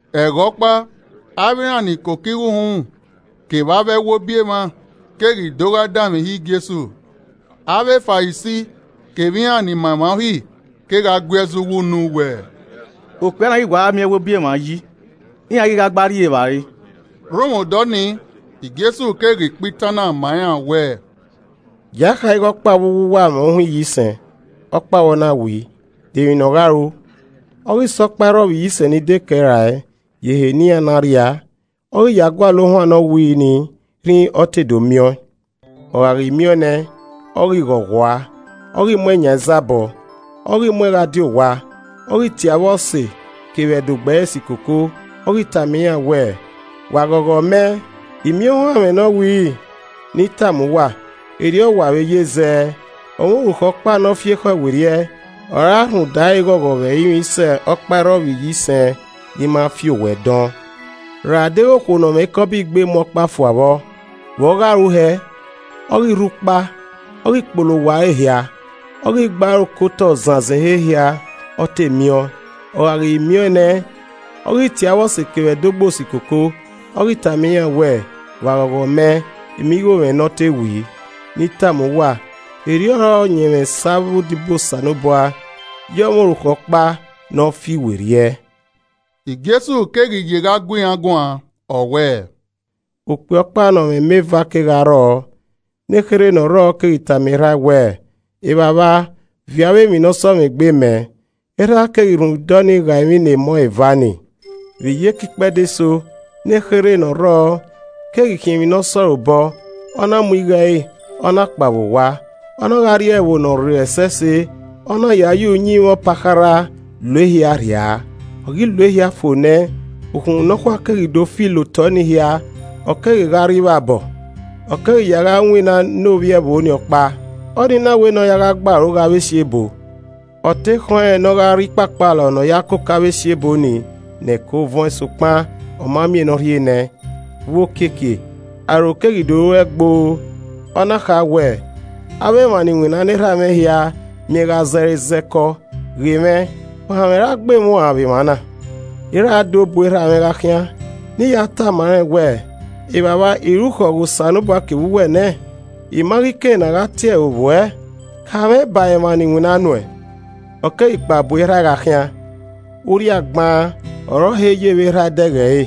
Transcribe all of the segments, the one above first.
Ẹghẹ ọkpa, avbe iran ni koko igho uhunmwu kevbe avbe ẹwobi emwa keghi do gha danmwehọ Jesu. Avbe Farisi kevbe iran ni ma emwa Uhi kegha gui ẹzọ uwu unu wẹ, “Ọkpia na ghi wa gha miẹn ẹwobi emwa yi, iran ghi gha gba rri evbare.” Rhunmwuda ọnii, Jesu keghi kpa itan na ma iran wẹẹ: “Gie a kha ighe ọkpa vbe uwu uwa mwẹ ohuan iyisẹn, ọkpa vbọ na wii, de emwi ne ọ gha ru? Ọ ghi sẹ ọkpairrọvbiyisẹn ni dekẹe rae ye ehe ne iran na rria, ọ ghi ya gualọ ohuan ne ọ wiri ni rhinrin ọ te do miẹn ọẹn. Ọ gha ghi miẹn ọẹn nẹ, ọ ghi ghọghọ ua, ọ ghi mu ẹn yan izabọ. Ọ ghi mu ẹn gha die owa, ọ ghi tie avbe ọse kevbe ẹdogbo ẹre si koko, ọ ghi tama iran wẹẹ, ‘Wa ghọghọ mẹ, I miẹn ohuan mwẹ ne ọ wiri!’ Ne I tama uwa, erriọ ọ wa vbe ye zẹ, ọmwa orukhọ ọkpa ne ọ fi ekhọe werriẹ, ọ re a rhunmwuda ẹre ghọghọ vbe ẹrinmwi sẹ ọkpairrọvbiyisẹn ni ma fi owẹ dọn. “Ra deghẹ okhuo ne ọ mwẹ ikọbọ igbe mu ọkpa fua vbọ, vbe ọ gha ru hẹ? Ọ ghi rhu ukpa, ọ ghi kpolo owa ẹre hia, ọ ghi gbe aro ke otọ zanzan ehe hia ọ te miẹn ọẹn. Ọ gha ghi miẹn ọẹn nẹ, ọ ghi tie avbe ọse kevbe ẹdogbo si koko, ọ ghi tama iran wẹẹ, ‘Wa ghọghọ mẹ, I miẹn igho mwẹ ne ọ te wii.’ Ne I tama uwa, erriọ ọre ọyẹnmwẹ sẹ avbe odibo Osanobua ye ọmwa orukhọ ọkpa ne ọ fi werriẹ.” Jesu keghi ye gha gu iran guan, ọ wẹẹ, “Okpia ọkpa ne ọ mwẹ emọ eva kegha rrọọ. Ne kherhe ne ọ rrọọ keghi tama erha ẹe wẹẹ, ‘Evbavba, viọ avbe emwi ne ọ sẹ mwẹ egbe mẹ.’ Erha ẹe keghi rhunmwuda ọnii ghae emwi ne emọ eva nii. Vbe iyeke ikpẹdẹ eso, nekherhe ne ọ rrọọ keghi khiẹn emwi ne ọ se ọre obọ, ọ na mu igho ẹre, ọ na kpao vbe owa. Ọ na gha rrie ẹvbo ne ọ rrei ẹsẹse, ọ na ya ye uyinmwẹ ọpakharha lo ehia rhia. Ọ ghi lo ehia fo nẹ, ukhunmwu nọkhua keghi do fi la otọe ni hia, ọ keghi gha rre ivbabọ. Ọ keghi ya gha winna ne ovbi ẹvbo nii ọkpa. Ọ nii na wẹ ne ọ ya gha gbe aro ghe avbe esiebo. Ọ te khọn rẹn ne ọ gha rri ikpakpalọ ne a ya koko avbe esiebo nii ne ẹko vuọn sokpan ọ ma miẹn ne ọ rhie nẹẹn. Vbe okiekie, aro keghi do ru ẹe gboo, ọ na kha wẹẹ, ‘Avbe emwa ni winna ne erha mwẹ hia miẹn gha zẹre zẹ kọ, ghe mwẹ, ohanmwẹ ra gbe mwẹ uan vbe emwa na. I ra do bu erha mwẹ gha khian ne I ya tama rẹn wẹẹ, Evbavba, I rukhọ ghe Osanobua kevbe uwẹ nẹ. I ma ghi kei ne a gha tie ẹre ovbi uẹ, ka mwẹ ba emwa ni winna nuẹn.’ Ọ keghi kpao bu erha ẹe gha khian. “Urria gbaan ọre ọ he ye vbe erha ẹe dẹghe ẹre,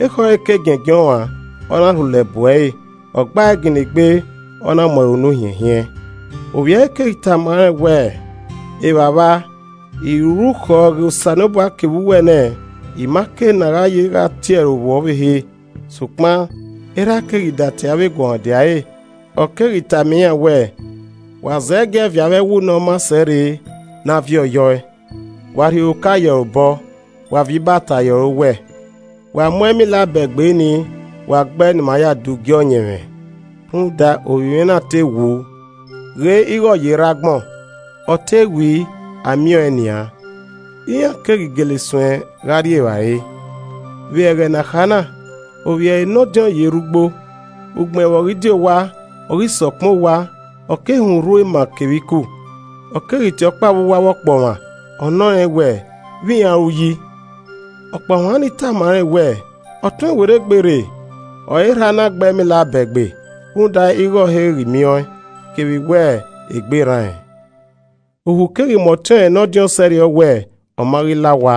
ekhọe nọẹn ruan, ọ na rhulẹ bu ẹre, ọ gba ẹe ginna egbe, ọ na mu ẹre unu hiẹnhien. Ovbi ẹre keghi tama rẹn wẹẹ, ‘Evbavba, I rukhọ ghe Osanobua kevbe uwẹ nẹ, I ma kei ne a gha ye gha tie ẹre ovbi uẹ ọvbehe.’ Sokpan erha ẹe keghi datie avbe eguọmwadia ẹre, ọ keghi tama iran wẹẹ, ‘Wa zẹgiẹ viọ avbe ẹwu ne ọ maa sẹ rre ne a viọ ye ọe, wa rhie oroka ye ẹre obọ, wa viọ ibata ye ẹre owẹ. Wa mu ẹmila abẹgbe nii, wa gbe ẹe ne ima ya dugie ọyẹnmwẹ. Rhunmwuda, ovbi mwẹ na te wu, ghe ighẹ ọ ye rre agbọn, ọ te wii, a miẹn ọẹn nian.’ Iran keghi gele suẹn gha rrie evbare. “Vbe ẹghẹ ne a kha na, ovbi ẹre ne ọdiọn ye rre ugbo. Ugbẹn vbe ọ ghi die owa, ọ ghi sẹ ọkpẹn owa, ọ keghi họn urhu ema kevbe iku. Ọ keghi tie ọkpa vbe uwu avbe ọkpọmwa, ọ nọ rẹn wẹẹ, ‘Vbe iran ru yi?’ Ọkpọmwa ni tama rẹn wẹẹ, ‘Ọtuẹn werriegbe rre, ọre erha a na gbe ẹmila abẹgbe rhunmwuda ighẹ ọ he ghi miẹn ọẹn, kevbe wẹ, egbe rran rẹn.’ Ohu keghi mu ọtiọnrẹn ne ọdiọn sẹrriọ wẹ ọ ma ghi la owa,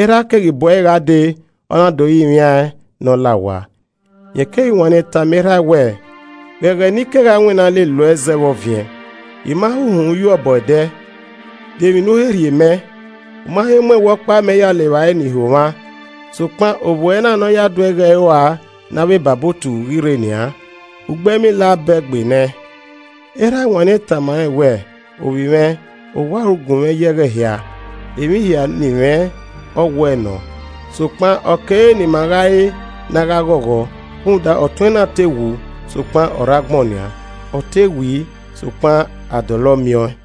erha ẹe keghi bu ẹre gha dee, ọ na do rinmwiaẹn ne ọ la owa. Rẹn keghi wanniẹn tama erha ẹe wẹẹ, ‘Ghe ẹghẹ ni kegha winna lele uẹ zẹ vbe ọviẹn, I ma he he uhunmwu ye uẹ obọ ẹdẹ. De emwi ne u he rhie mẹ? U ma he mu ẹwe ọkpa mẹ ya le evbare ne ihomwa. Sokpan ovbi uẹ na ne ọ ya duẹ igho ẹre ua ne avbe ebabotu ghi rre nian, u gbe ẹmila abẹgbe nẹẹn!’ Erha ẹe wanniẹn tama rẹn wẹẹ, ‘Ovbi mwẹ, owa ọre u gunmwẹ ye ẹghẹ hia, emwi hia ne I mwẹ, ọ wuẹ nọ. Sokpan ọ kere ne ima gha re ne a gha ghọghọ, rhunmwuda ọtuẹn na te wu, sokpan, ọ rre agbọn nian, ọ te wii, sokpan a dọlọ miẹn ọẹn.’”